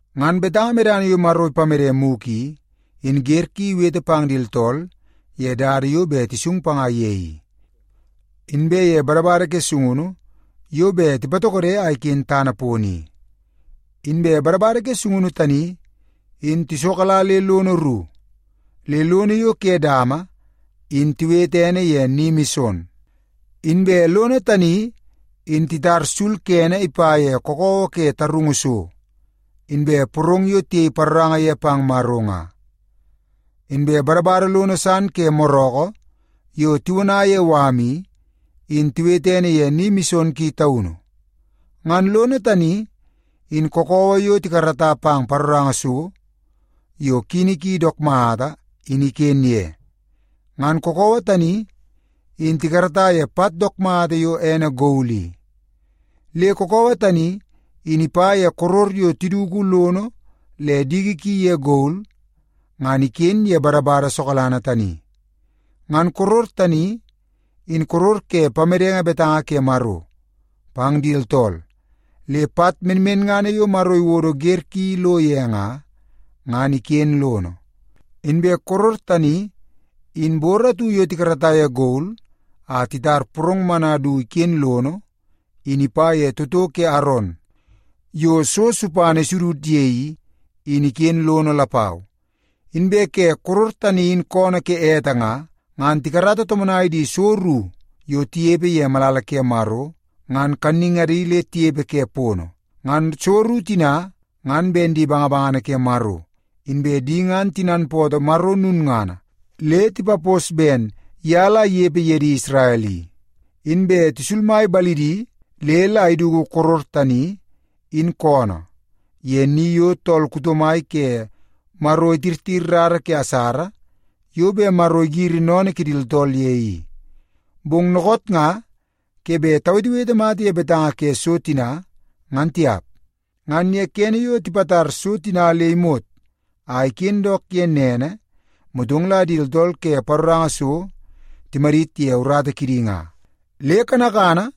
Ngan betanga medana yo Maro ipamede muku i, in ger ki iwete pang di tooltool ye dada yo be tisung panga ye i, inbe ye badabada ke sungunu yo be tipatokodo a iken tana pono i. Inbe badabada ke sungunu tani in tisokala le lono ru. Le lono yo ke dama in tiwete ene ye Ni Mison. Inbe lono tani in titara sul kene ipa ye kookoowoo ke tarungu so, inbe porong yo tiyei paroranga ye pang Maro nga. Inbe badabada lono san ke moroko yo tiwona ye wam i, in tiwete ene ye Ni Mison Ki Taunu. Ngan lono tani, in kookoowoo yo tikarata pang paroranga so yo kini ki dook mata, in iken ye. Ngan kookoowoo tani in tikarata ye pat dook mata yo ene gol i. Le kookoowoo tani in ipa ye koror yo tiduku lono le diki ki ye gol ngan iken ye badabada sokalanga tani. Ngan koror tani, in koror ke pamedenge betanga ke Maro pang di tooltool, le pat menmenngana yo Maro iwodo ger ki lo ye nga, ngan iken lono. Inbe koror tani, in bor atu yo tikarata ye gol a titar porong mana du iken lono, in ipa ye toto ke Aron yo so supana isudud ye i, in iken lono lapau. Inbe ke koror tani in koonoo ke ete nga, ngan tikarata tomonai di so ru yo tiyepe ye malala ke Maro, ngan kanningadi le tiyepe ke pono. Ngan so ru tina ngan ben di bangabangana ke Maro, inbe di ngan tinanpootoo Maro nunngana le tipapos ben ya la iyepe ye di Isrel i. Inbe tisulmai balidi le la iduku koror tani in koonoo ye ni yo tool kuto mai ke Maro itirtir rara ke asara yo be Maro igiri noonoo ke di tooltool ye i. Bong nookoot nga ke be tawetewete mata ye betanga ke so tina, ngan tiap. Ngan ye kene yo tipatar so tina le imot a iken dook ye nene, motong la di tooltool ke paroranga so timadit ye urata kidi nga. Le kanakana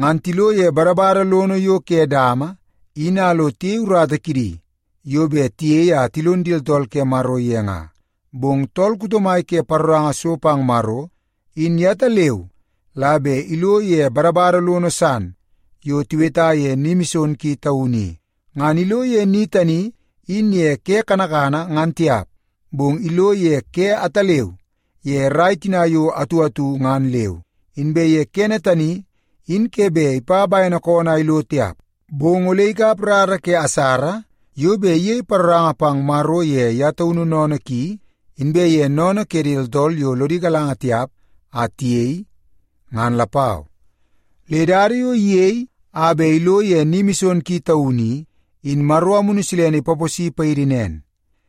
ngan tilo ye badabada lono yo ke dama, in a lo tiyei urata kidi yo be tiyei a tilon di tooltool ke Maro ye nga. Bong tool kuto mai ke paroranga so pang Maro, in ya taleu la be ilo ye badabada lono san yo tiweta ye Ni Mison Ki Taunu i. Ngan ilo ye ni tani in ye ke kanakana ngan tiap, bong ilo ye ke ataleu ye rai tina yo atu atu ngan leu. Inbe ye kene tani in ke be ipa baene koonoo a ilo tiap, bong ole ikap rara ke asara yo be iyei paroranga pang Maro ye ya taunu noonoo ki, inbe ye noonoo ke di tooltool yo lodi galanga tiap a tiyei, ngan lapau. Le dada yo iyei a be ilo ye Ni Mison Ki Taunu i, in Maro Amunu Silene ipapos paidi nen: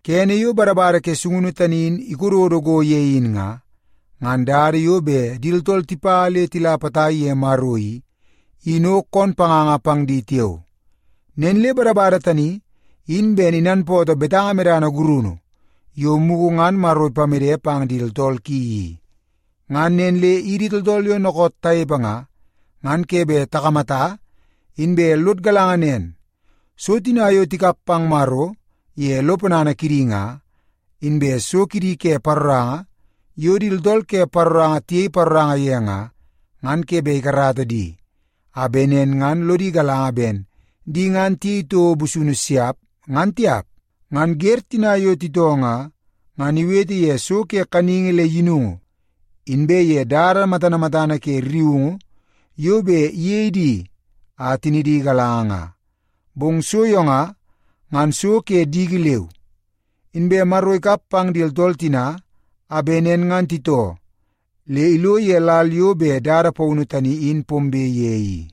Kene yo badabada ke sungunu tani in ikododo go ye in nga, ngan dada yo be di tooltool tipa le tila potai pang ye Maro i, in o koon panganga pang di tiao. Nen le badabada tani in ben inanpootoo betanga medana gurunu yo muku ngan Maro ipamede pang di tooltool ki i. Ngan nen le idi tooltool yo nookoot tayepe nga, ngan ke be takamata inbe lod galanga nen, so tina yo tikap pang Maro ye lo ponana kidi nga, inbe so kidi ke paroranga yo di tooltool ke paroranga tiyei paroranga ye nga, ngan ke be ikarata di a be nen ngan lodi galanga ben di ngan tiyei touo busunu siap, ngan tiap. Ngan ger tina yo titoo nga, ngan iwete ye so ke kaningi le yinungu, inbe ye dada matana matana ke rriungu yo be iyei di a tinidi igalanga nga. Bong so yo nga, ngan so ke diki leu. Inbe Maro ikap pang di tooltool tina a be nen ngan titoo le ilo ye lal yo be dada paunu tani in pombe ye i.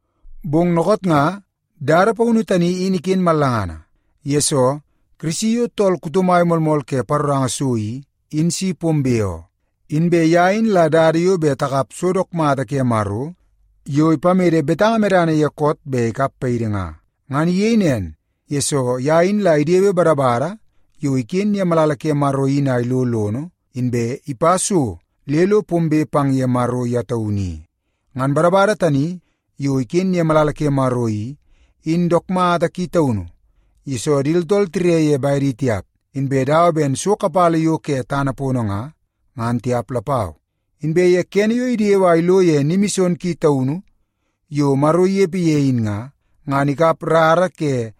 Bong nookoot nga dada paunu tani in iken mallangana, yesoo Kirisi yo tool kuto mai moolmool ke paroranga so i, in si pombe oo. Inbe ya in la dada yo be takap so dook mata ke Maro yo ipamede betanga medana ye koot be ikap paidi nga. Ngan iyei nen, yesoo ya in la idewe badabada yo iken ye malala Maro in a ilo lono, inbe ipa so le lo pombe pang ye Maro ya taunu i. Ngan badabada tani yo iken ye malala ke Maro i, in dook mata ki taunu, yesoo di tooltool tire ye baedi tiap, inbe dawa ben so kapala yo ke tana pono nga, ngan tiap lapau. Inbe ye kene yo idewe a ilo ye Ni Mison Ki Taunu yo Maro iyepe ye in nga, ngan ikap rara ke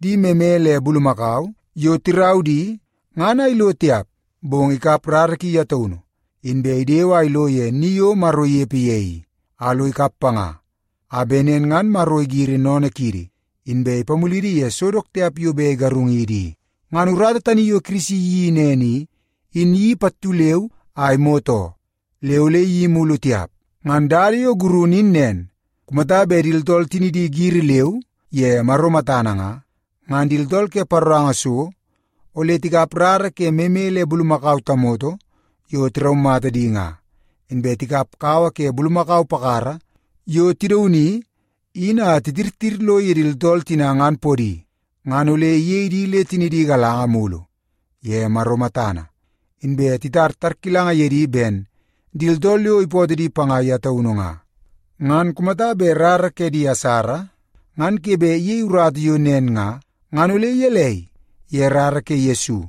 di meme le bulumakau, yo tirau di, ngan a ilo tiap. Bong ikap rara ki ya taunu, inbe idewe a ilo ye ni yo Maro iyepe ye i, a lo ikap panga, a be nen ngan Maro igiri noonoo kiidi, inbe ipamulidi ye so dook tiap yo be igarungidi i. Ngan urata tani yo Kirisi iyeii nen i, in iyeii pattu leu a imot oo. Le ole iyeii mulu tiap. Ngan dada yo gurunu in nen. Kumata be di tooltool tinidi giri leu ye Maro matana nga, ngan di tooltool ke paroranga so ole tikap rara ke meme le bulumakau tamoto yo tiraumata di nga, inbe tikap kawa ke bulumakau pakara yo tidauni in a titirtir lo ye di tooltool tina ngan podi, ngan ole iyei di le tinidi igalanga mulu ye Maro matana, inbe itara tarkilanga ye di ben di tooltool yo ipootoo di panga ya taunu nga. Ngan kumata be rara ke di asara ngan ke be iyei urata yo nen nga, ngan ole yelei ye rara ke Yesu?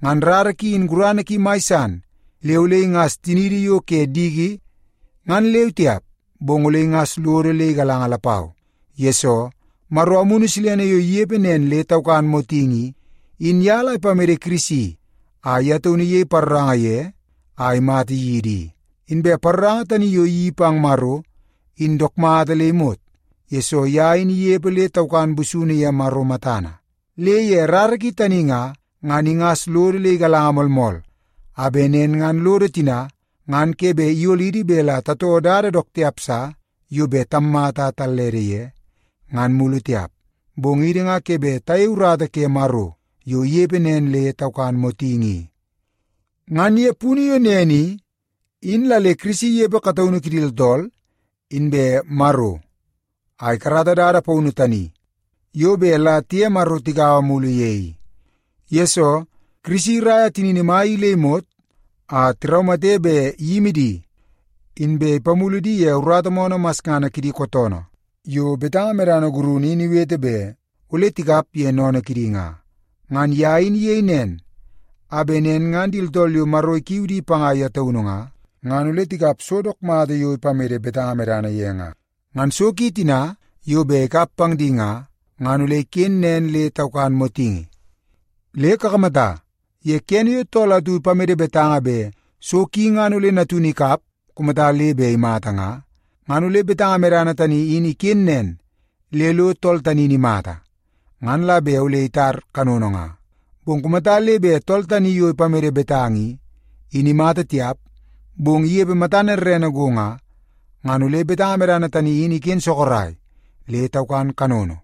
Ngan rara ki in gurana ki mai san le ole ingas tiniidi yo ke diki ngan leu tiap, bong ole ingas lodo le igalanga lapau. Yesoo, Maro Amunu Silene yo iyepe nen le taukan motingi i, in ya la ipamede Kirisi a ya taunu iyei paroranga ye a imata yidi i. Inbe paroranga tani yo iyeii pang Maro in dook mata le imot, yesoo ya in iyepe le taukan busunu ye Maro matana. Le ye rara ki tani nga, ngan ingas lodo le igalanga moolmool, a be nen ngan lodo tina ngan ke be iyolidi be la tatoo dada dook tiap sa yo be tammata a tallede ye, ngan mulu tiap, bong idi nga ke be tayei urata ke Maro yo iyepe nen le taukan motingi i. Ngan ye punu yo nen i, in la le Kirisi iyepe kataunu kidi tooltool inbe Maro a ikarata dada paunu tani yo be la tiye Maro tigaua mulu ye i. Yesoo, Kirisi iraia tinini mai i le imot a tiraumate be iyimi di, inbe ipamulu di ye urata moonoo masngana kidi kootoonoo yo betanga medana gurunu in iwete be ole tikap ye noonoo kidi nga. Ngan ya in iyei nen a be nen ngan di tooltool yo Maro ikiu di panga ya taunu nga, ngan ole tikap so dook mata yo ipamede betanga ye nga. Ngan so ki tina yo be ikap pang di nga, ngan ole iken nen le taukan motingi. Le kakamata, ye kene yo tool atu ipamede betanga be so ki ngan ole natunu ikap kumata le be imata nga, ngan ole betanga medana tani in iken nen le lo tool tani in imata, ngan la be ole itar kanono nga. Bong kumata le be tool tani yo ipamede betanga i, in imata tiap, bong iyepe matana rrene go nga, ngan ole betanga medana tani in iken sokorai le taukan kanono,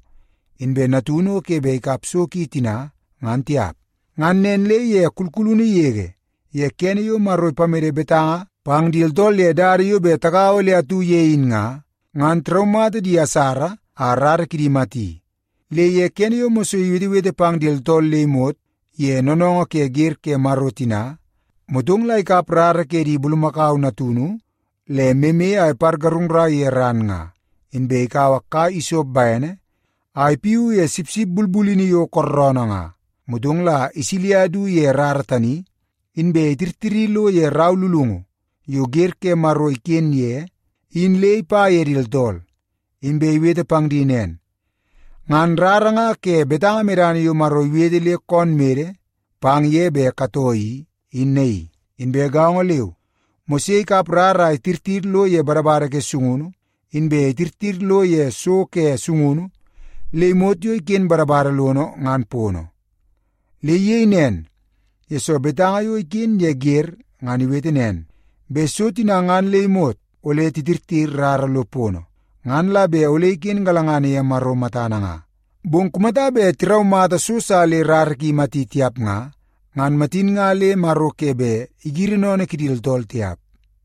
inbe natunu o ke be ikap so ki tina ngan tiap. Ngan nen le ye kulkulunu yege ye kene yo Maro ipamede betanga pang di tooltool ye dada yo be tagaua le atu ye in nga, ngan tiraumata di asara a rara kidi imati. Le ye kene yo Mose iwetewete pang di tooltool le imot ye noonoongoo ke ger ke Maro tina, motong la ikap rara ke di bulumakau natunu le meme a ipargarungrai ye ran nga. Inbe ikaua kai isop baene a ipiu ye sipsip bulbulini yo kooroonoo nga, motong la isilia idu ye rara tani, inbe itirtiri lo ye rau lulungu yo ger ke Maro iken ye in le ipa ye di tooltool, inbe iwete pang di nen, “Ngan rara nga ke betanga medana yo Maro iwete le koon mede pang ye be katoo i, Inbe gaongo leu, Mose ikap rara a itirtir lo ye badabada ke sungunu, inbe itirtir lo ye so ke sungunu le imot yo iken badabada lono ngan pono. Le iyei nen, yesoo betanga yo iken ye ger ngan iwete nen, be so tina ngan le imot ole titirtir rara lo pono, ngan la be ole iken galangana ye Maro matana nga. Bong kumata be tiraumata so sa le rara ki imati tiap nga, ngan matin nga le Maro ke be igiri noonoo kidi tooltool tiap.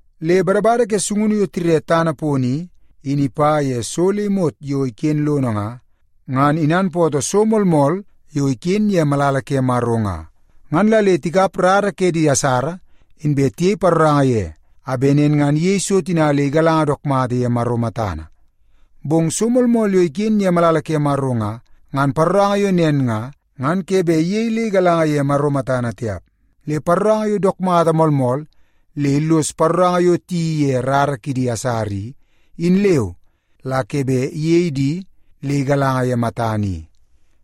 Le badabada ke sungunu yo tire tana pono i, in ipa ye so le imot yo iken lono nga, ngan inanpootoo so moolmool yo iken ye malala ke Maro nga. Ngan la le tikap rara ke di asara, inbe tiyei paroranga ye, a be nen ngan iyei so tina le igalanga dook mata ye Maro matana. Bong so moolmool yo iken ye malala ke Maro nga, ngan paroranga yo nen nga, ngan ke be iyei le igalanga ye Maro matana tiap. Le paroranga yo dook mata moolmool le illoso paroranga yo tiyeii ye rara ke di asara i, in leu la ke be iyei di le igalanga ye matana i.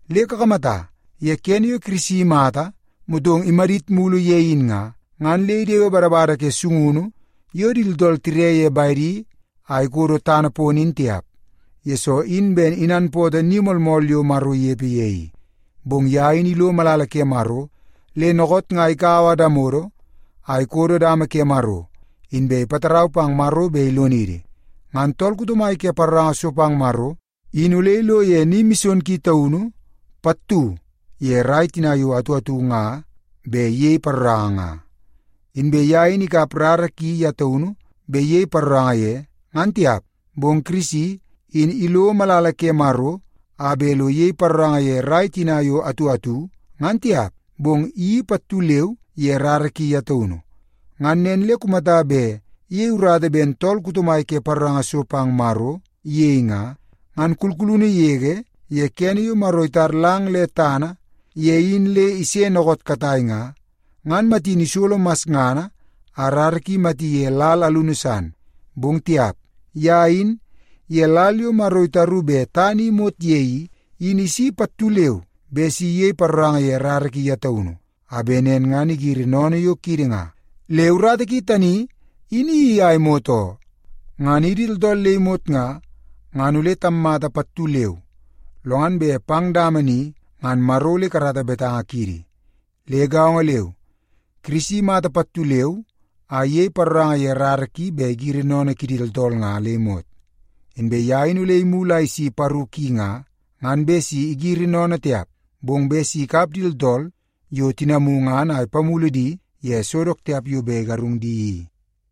Le kakamata, ye kene yo Kirisi imata motong imadit mulu ye in nga, ngan le idewe badabada ke sungunu yo di tooltool tire ye baedi a ikodo tana pono in tiap, yesoo in ben inanpootoo ni moolmool yo Maro iyepe ye i. Bong ya in ilo malala ke Maro, le nookoot nga ikaua damodo a ikodo dama ke Maro, inbe ipatarau pang Maro be ilonidi. Ngan tool kuto mai ke paroranga so pang Maro in ole ilo ye Ni Mison Ki Taunu pattu ye rai tina yo atu atu nga be iyei paroranga nga. Inbe ya in ikap rara ki ya taunu be iyei paroranga ye, ngan tiap. Bong Kirisi, in ilo malala ke Maro a be lo iyei paroranga ye rai tina yo atu atu, ngan tiap, bong iyeii pattu leu ye rara ki ya taunu. Ngan nen le kumata be iyei urata ben tool kuto mai ke paroranga so pang Maro iyei nga, ngan kulkulunu yege ye kene yo Maro itar lang le tana ye in le ise nookoot katai nga, ngan matin isolo masngana a rara ki imati ye lal alunu san. Bong tiap! Ya in, ye lal yo Maro itaru be tana i imot ye i, in isi pattu leu be si iyei paroranga ye rara ki ya taunu, a be nen ngan igiri noonoo yo kiidi nga. Le urata ki tani in iyeii a imot oo. Ngan idi tooltool le imot nga, ngan ole tammata pattu leu, lo ngan pang dama ni ngan Maro ole ikarata betanga kiidi. Le gaongo leu, Kirisi imata pattu leu a iyei paroranga ye rara ki be igiri noonoo kidi tooltool nga le imot. Inbe ya in ole imulu a isi paru ki nga, ngan be si igiri noonoo tiap, bong be si ikap di tooltool yo tinamu ngan a ipamulu di ye so dook tiap yo be igarung di i.